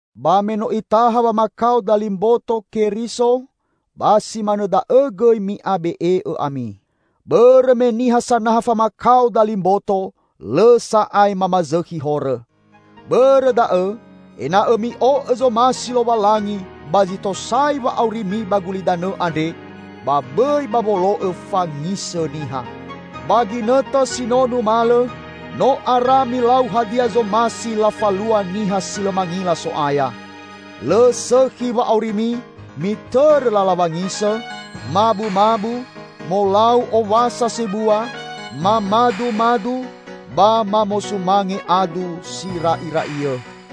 Ba me no Itaha wamakao dali mboto Keriso, ba si manõ da'õ gõi mi'abe'e'õ ami. Bõrõ me niha sanaha famakao dali mboto, lõ sa'ae mamazõkhi horõ. Bõrõ da'õ, ena'õ mi'o'õ zomasi Lowalangi ba zi tosai wa'aurimi ba gulidanõ andre, ba bõi ba wolo'õ fangisõ niha. Ba ginõtõ si no numalõ, no ara milau hadia zomasi lafalua niha si lõ mangila So'aya. Lõ sõkhi wa'aurimi, mitõrõ lala wangisõ, mabumabu, molau owasa sebua, mamadumadu, ba mamosumange adu, sira'ira'iõ.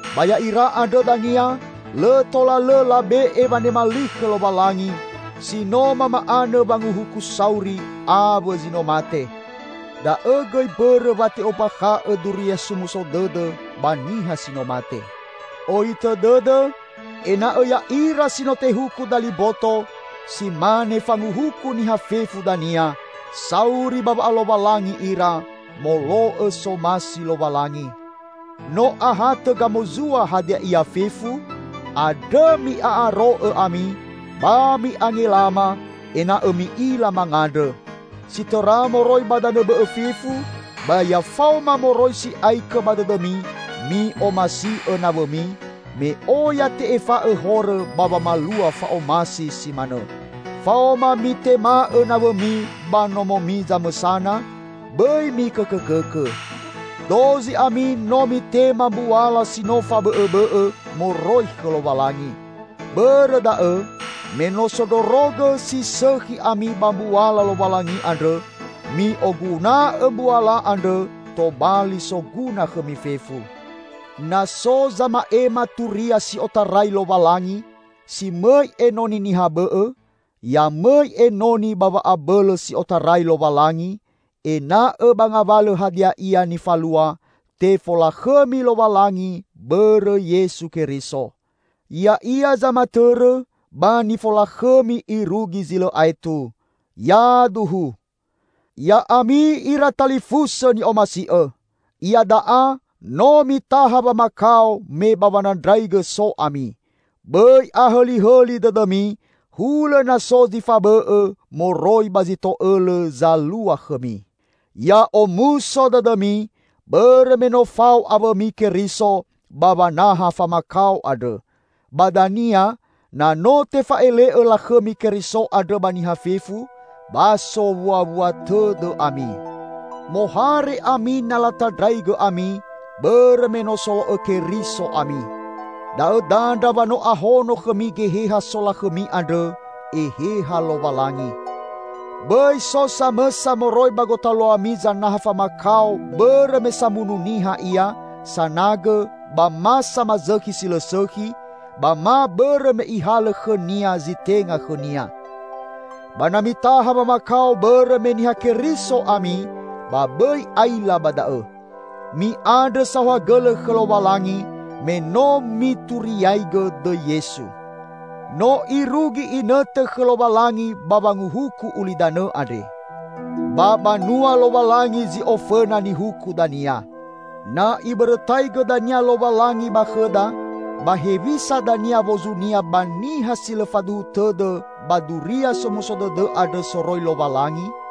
Ba ya'ira andrõ dania, lõ tola lõ labe'e wanema li khõ Lowalangi si no mama'anõ wanguhuku sauri awõ zi no mate. Da'õ gõi mbõrõ wa te'ombakha'õ Duria Somuso Dõdõ ba niha si no mate. Ohitõ dõdõ ena'õ ya'ira si no tehuku dali mboto -- si mane fanguhuku niha fefu dania -- sauri ba wa'alowalangi ira molo'õ somasi Lowalangi. No ahatõ gamozua hadia ia fefu, andrõ mi'a'aro'õ ami, ba mi'angelama, ena'õ mi'ila mangandrõ. Si tõra moroi ba danõ bõ'õ fefu, ba ya faoma moroi si'aikõ ba dõdõmi mi'omasi'õ nawõmi, me oya te'efa'õ horõ ba wamalua fa'omasi si manõ. Faoma mitema'õ nawõmi ba nomomi zamõsana, bõi mikõkõkõkõ. Dozi ami no mitema mbuala si no fabõ'õbõ'õ moroi khõ Lowalangi. Bõrõ da'õ, me no sondrorogõ si sõkhi ami ba mbuala Lowalangi andrõ, mi'oguna'õ mbuala andrõ tobali soguna khõmi fefu. Na so zama'ema turia si otarai Lowalangi, si mõi enoni niha bõ'õ, ya mõi enoni ba wa'abõlõ si otarai Lowalangi, ena'õ ba ngawalõ hadia ia nifalua, tefolakhõmi Lowalangi bõrõ Yesu Keriso. Ya'ia zamatõrõ, ba nifolakhõmi irugi zi lõ aetu. Yaduhu! Ya'ami ira talifusõ ni'omasi'õ! Iada'a no mitaha wamakao me ba wanandraigõ so ami. Bõi ahõlihõli dõdõmi, hulõ na so zi fabõ'õ moroi ba zi to'õlõ zalua khõmi. Ya omuso dõdõmi, bõrõ me no fao awõmi Keriso ba wanaha famakao andrõ. Ba dania, na no tefa'ele'õ lakhõmi Keriso andrõ ba niha fefu, ba sowuawua tõdõ ami. Mohare ami na latandraigõ ami, bõrõ me no solo'õ Keriso ami. Da'õ dandra wa no ahono khõmi Geheha solakhõmi andrõ, Eheha Lowalangi. Bõi so samõsa moroi ba gotaluami zanaha famakao bõrõ me samunu niha ia, sanagõ, ba ma samazõkhi si lõ sõkhi, ba ma bõrõ me ihalõ khõnia zi tenga khõnia. Ba na mitaha wamakao bõrõ me Niha Keriso ami, ba bõi aila ba da'õ. Mi'andrõ saohagõlõ khõ Lowalangi, me no mituriaigõ dõi Yesu. No irugi inõtõ khõ Lowalangi ba wanguhuku ulidanõ andre. Ba banua Lowalangi zi ofõna nihuku dania. Na Ibõrõtaigõ dania Lowalangi ba khõda, ba hewisa dania wozunia ba niha si lõ faduhu tõdõ ba Duria Somuso Dõdõ andrõ soroi Lowalangi?